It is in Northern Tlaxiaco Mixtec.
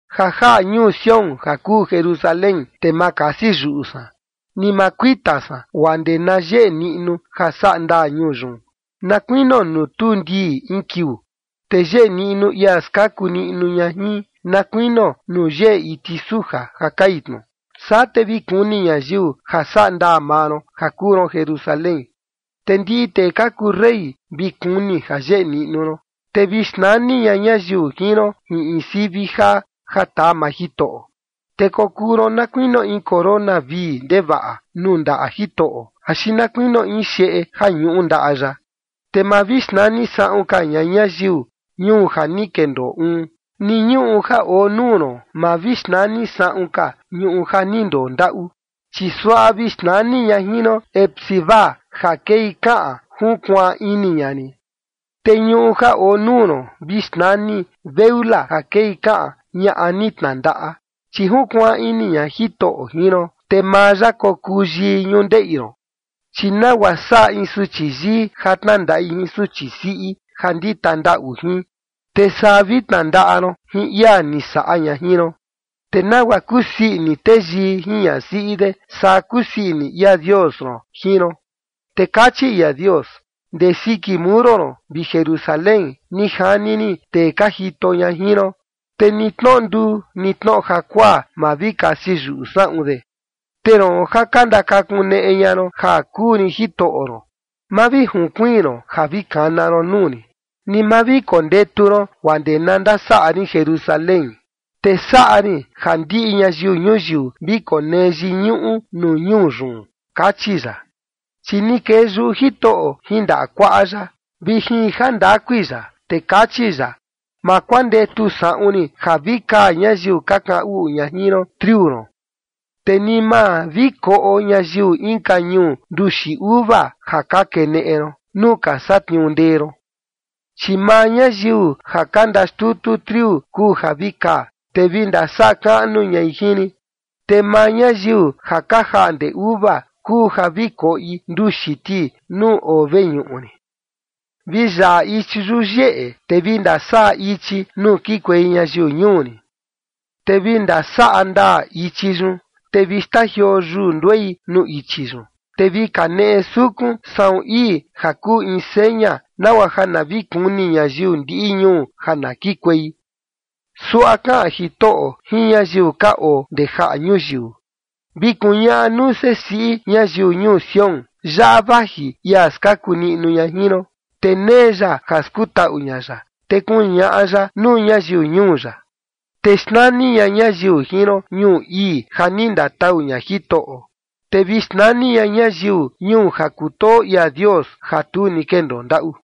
Ja jaꞌa ñuu Sión ja kuu Jerusalén te ma kasi yuꞌu san, ni maa kuita san guaa ndee na yeꞌe niꞌnu ja sandaa ñuu yun, na kuinio nuu tuu ndii in kiuu te yeꞌe niꞌnu ia skaku niꞌnu ña jin, na kuinio nuu yeꞌe iti suja ja kai tnu. Saa te vi kuni ñayiu ja sandaa maa ron ja kuu ron Jerusalén, te ndiꞌi tee ka kuu rey vi kuni ja yeꞌe niꞌnu ron, te vi xnani ña ñayiu jin ron jin in sivi jaa ja taa maa Jitoꞌo. Te kokuu ron na kuinio in corona vii ndevaꞌa nuu ndaꞌa Jitoꞌo, axi na kuinio in xeꞌe ja ñuꞌu ndaꞌa ya. Te ma vi xnani saꞌun ka ña ñayiu “ñuu ja ni kendoo uun” ni ñuꞌu ja oo nuu ron ma vi xnani saꞌun ka “ñuꞌu ja ni ndondaꞌu”, chi suaꞌa vi xnani ña jin ron “Hefzi-ba” ja kei kaꞌan “junkuaan ini ña rin” te ñuꞌu ja oo nuu ron vi xnani “Beula” ja kei kaꞌan “ñaꞌa ni tnandaꞌa” chi junkuaan ini ña Jitoꞌo jin ron, te maa ya kokuu yii ñundeꞌi ron. Chi nagua saꞌa in suchi yii ja tnandaꞌi jin suchi siꞌi ja ndita ndaꞌu jin, te saa vi tnandaꞌa ron jin ia ni saꞌa ña jin ron. Te nagua kusii ini teyii jin ñasiꞌi de, saa kusii ini ia Dios ron jin ron. Te kachi ia Dios: “Ndee siki muro ron, vi Jerusalén, ni jani rin tee ka jito ña jin ron, te ni tnoꞌo nduu ni tnoꞌo jakuaa, ma vi kasi yuꞌu saꞌun de. Te roon ja ka ndakakuneꞌe ña ron ja kuu rin Jitoꞌo ron, ma vi junkuiin ron ja vi kana ron nuu rin, ni ma vi kondetu ron guaa ndee na ndasaꞌa rin Jerusalén, te saꞌa rin ja ndiꞌi ñayiu ñuyiu vi konee yiñuꞌu nuu ñuu yun”, kachi ya. Chi ni kee yuꞌu Jitoꞌo jin ndaꞌa kuaꞌa ya vi jin jandakui ya, te kachi ya: “Ma kuandetu saꞌun rin ja vi kaa ñayiu ka kaꞌan uꞌu ña jin ron triu ron, te ni ma vi koꞌo ñayiu inka ñuu nduxi uva ja ka keneꞌe ron nuu ka satniuu ndee ron. Chi maa ñayiu ja ka ndaxtutu triu kuu ja vi kaa, te vi ndasaꞌa kaꞌnu ñai jin rin. Te maa ñayiu ja ka jaꞌnde uva kuu ja vi koꞌi nduxi ti nuu oo veñuꞌu rin.” Vi yaꞌa ichi yuyeꞌe, te vi ndasaꞌa ichi nuu kikuei ñayiu ñuu rin, te vi ndasaꞌa ndaa ichi yun, te vi xtajioo yuu nduei nuu ichi yun, te vi kaneꞌe sukun saꞌun ii ja kuu in seña nagua ja na vi kuni ñayiu ndiꞌi ñuu ja na kikuei. Suaꞌa kaꞌan Jitoꞌo jin ñayiu ka oo ndee jaꞌa ñuyiu: “Vi kuñaꞌa nuu sesiꞌi ñayiu ñuu Sión: Yaꞌa vaji ia skaku niꞌnu ña jin ron, te nee ya ja skutaꞌu ña ya, te kuñaꞌa ya nuu ñayiu ñuu ya.” Te xnani ña ñayiu jin ron “ñuu ii, ja ni ndatau ña Jitoꞌo”. Te vi xnani ña ñayiu “ñuu ja kutoo ia Dios ja tu ni kendoo ndaꞌu”.